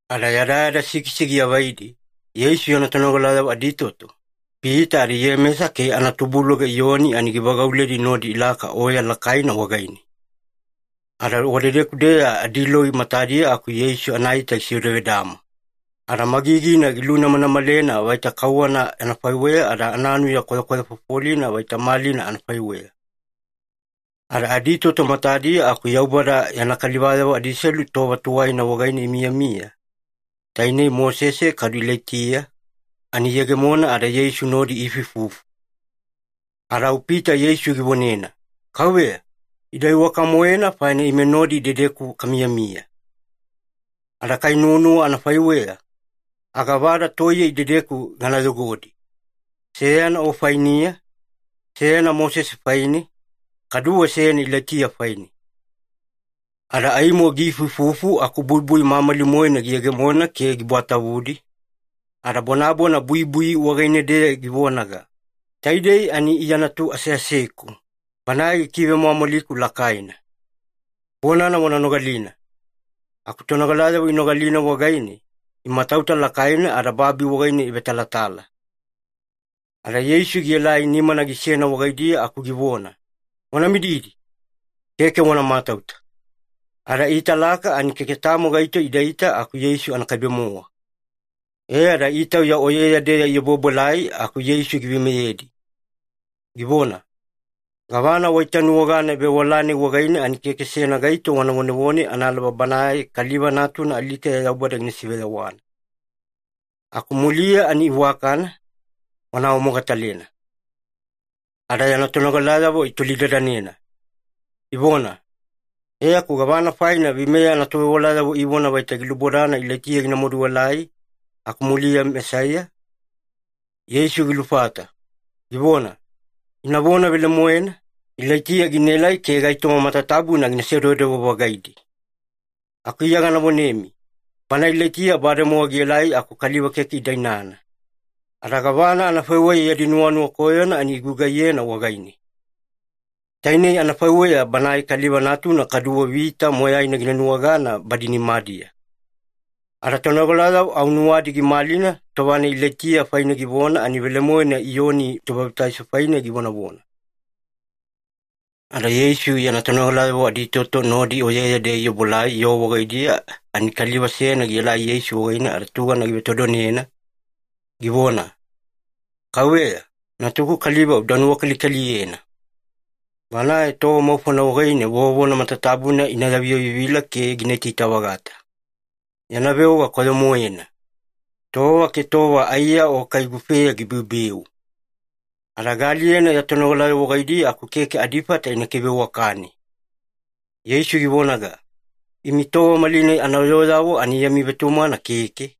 Ada yadayada sikisi giavaidi, Yeisu yana tonogalayavo aditoto, Pita ada Iyemesa ke anatubuluga Iyoni ani givagauledi nodi ilaka oya lakaina wagaine. Ada wadedeku-deya adiloi matadiya aku Yeisu anaita gisevedavedama. Ada magigina gilunamanamalena vaita kauwana anafaiweya, ada ananuya gikwayafofolina vaita malina anafaiweya. Ada aditoto matadiya aku Yaubada yana kalivayavo adiselu tova tuwaina wagaine imiyamiya, tainei Mosese kadu Ilaitiya, ani iyegemona ada Yeisu nodi iifuifufu. Ada au Pita Yeisu givonena, “Kauveya, ida iwaka-moena faina ime nodi idedeku kamiyamiya. Ada kai ya nuwanuwa anafaiweya, aga vada toiye idedeku gana yogodi. Seyana O fainiya, seyana Mosese faine, kaduwe seyana Ilaitiya faine.” Ada aimo giifuifufu aku buibui mamali-moena giyegemona ke gibwatavudi, ada bonabona buibui wagaine-deya givonaga, “Taidei ani Iya Natu aseaseku, Banae gikivemwamwaliku lakaina. Bonana wana nogalina.” Aku tonogalayavo inogalina wagaine, imatauta lakaina ada babi wagaine ivetalatala. Ada Yeisu gielai nimana gisena wagaidiya aku givona, “Wana mididi. Keke wana matauta.” Ada iitalaka ani keke tamo gaito idaita aku Yeisu anakaibe-mowa. E ada itauya oyeya-deya iobuobuelai aku Yeisu giveimeyedi, givona, “Gavana waitanuwagana vewala-nai wagaine ani keke seyana gaito wana vonevone analaba Banae Kaliva Natuna alikeya Yaubada gina siveyawana. Aku muliya ani iwakana, wana awamogatalena.” Ada yana tonogalayavo itolidadanena, ivona, “E aku gavana faina veimeya anatovewalayavo ivona vaita gilubodana Ilaitiya gina maduelai, aku muliya Mesaiya?” Yeisu gilufata, givona, “Ina vona velemoena, Ilaitiya ginaelai ke gaitoma matatabuna gina sedewedewe-vagiledi. Aku Iya gana vonemi, bana Ilaitiya bademowa gielai aku kaliva keke ida inana, ada gavana anafaiweya yadi nuwanuwa koyona ani igugaiyena wagaine. Tainei anafaiweya Banae Kaliva Natuna kaduwe vita moyaina gina nuwagana badi nimadiya.” Ada tonogalayavo au nuwadi gimalina tova-nai Ilaitiya faine givona ani velemoena Iyoni Tobabitaiso faine givonavona. Ada Yeisu yana tonogalayavo aditoto nodi oyeya-deya iobuelai yoo wagaidiya, ani kaliva seyana gielai Yeisu wagaine ada tugana givetodonena, givona, “Kauveya, natuku kaliva uda nuwakalikaliyena. Banae tova maufona wagaine vovona matatabuna ina yaviyavivila ke gina itaita-vagata. Yana veoga koyo-moena. Tova ke tova aiya o kai gufeya gibeubeu. Ada gaaliyena ya tonogalayavo wagaidiya aku keke adifata ina kiveiwakane.” Yeisu givonaga, “Imi tova malinai anayooyavo ani yami vetumagana keke,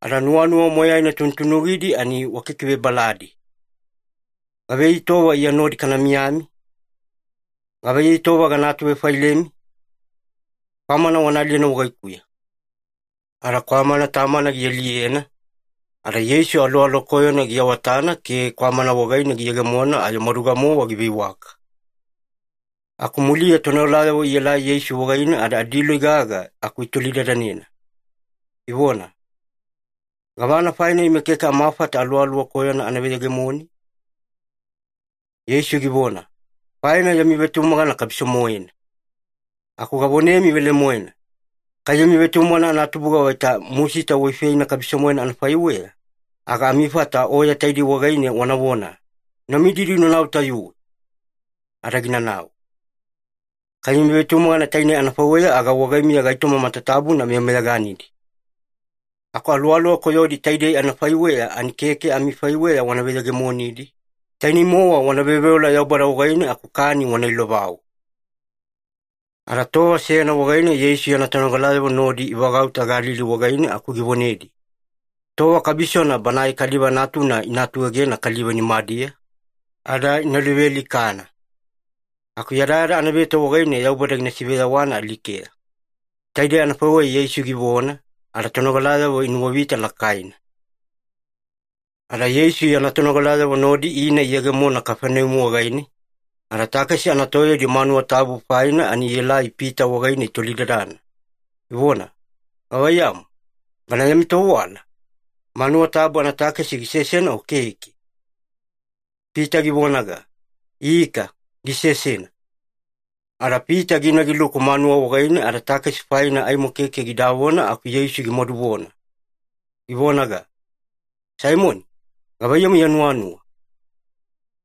ada nuwanuwa moyaina tunutunugidi ani wakikivebaladi. Gavaiyei tova Iya nodi kana miyamiya? Gavaiyei tova gana atuvefailemi? Kwamana wana aliyena wagaikuya.” Ada kwamana tamana gialiyena, ada Yeisu aluwaluwa koyona giawatana ke kwamana wagaine giyegemona ayo maduga-mowa giveiwaka. Aku muliya tonogalayavo ielai Yeisu wagaine ada adiloi gaga aku itolidadanena, ivona, “Gavana faina ime keke amafata aluwaluwa koyona ana veyegemoni?” Yeisu givona, “Faina yami vetumagana kabiso-moena. Aku gavonemi velemoena, kai yami vetumagana anatubuga vaita musita waifeina kabiso-moena anafaiweya, aga amifata oya taidei wagaine wanavona, ‘Una mididi unanau tayuwe.’ Ada ginanau. Kai yami vetumagana tainei anafaiweya aga wagaimiya gaitoma matatabuna meyameyaganidi. Aku aluwaluwa koyodi taidei anafaiweya ani keke amifaiweya wana veyegemonidi, tainei-mowa wana veoveola Yaubada wagaine aku kani wana ilovau.” Ada tova seyana wagaine Yeisu yana tonogalayavo nodi ivagauta Galili wagaine aku givonedi, “Tova kabisona Banae Kaliva Natuna ina atuegena kaliva nimadiya, ada ina luvealikana. Aku yadayada anaveto wagaine Yaubada gina siveyawana alikeya.” Taidei anafaiweya Yeisu givona, ada tonogalayavo inuwavita lakaina. Ada Yeisu yana tonogalayavo nodi ina iyegemona Kafaneumi wagaine, ada takesi anatoyaudi manuwa tabu faina ani ielai Pita wagaine itolidadana, ivona, “Gavaiyamu, bana yami tovewala, manuwa tabu anatakesi gisesena o keke?” Pita givonaga, “Ika, gisesena.” Ada Pita gina giluku manuwa wagaine ada takesi faina aimo keke gidavona aku Yeisu gimaduvona, givonaga, “Saimoni, gavaiyamu ya nuwanuwa?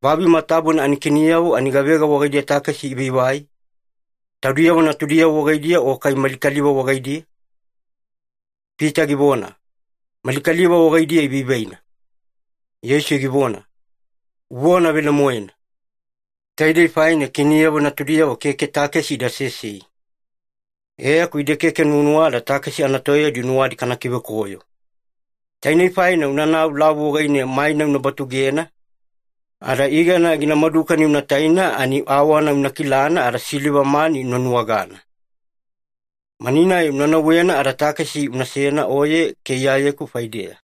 Babi matatabuna anakiniyavo ani gavega wagaidiya takesi ivaivai? Taudiyavo natudiyavo wagaidiya o kai mali kaliva wagaidiya?” Pita givona, “Mali kaliva wagaidiya ivaivaina.” Yeisu givona, “Uvona velemoena. Taidei faina kiniyavo natudiyavo keke takesi ida sesei. E aku ide keke nuwanuwada takesi anatoyaudi nuwadi kana kivekoyo. Tainei faina unanau lavu wagaine maina una batugena, ada igana gina madukani una taina ani awana una kilana ada siliva mani una nuwagana. Mani-nai una nauwena ada takesi unasena oye ke Iyayeku faideya.”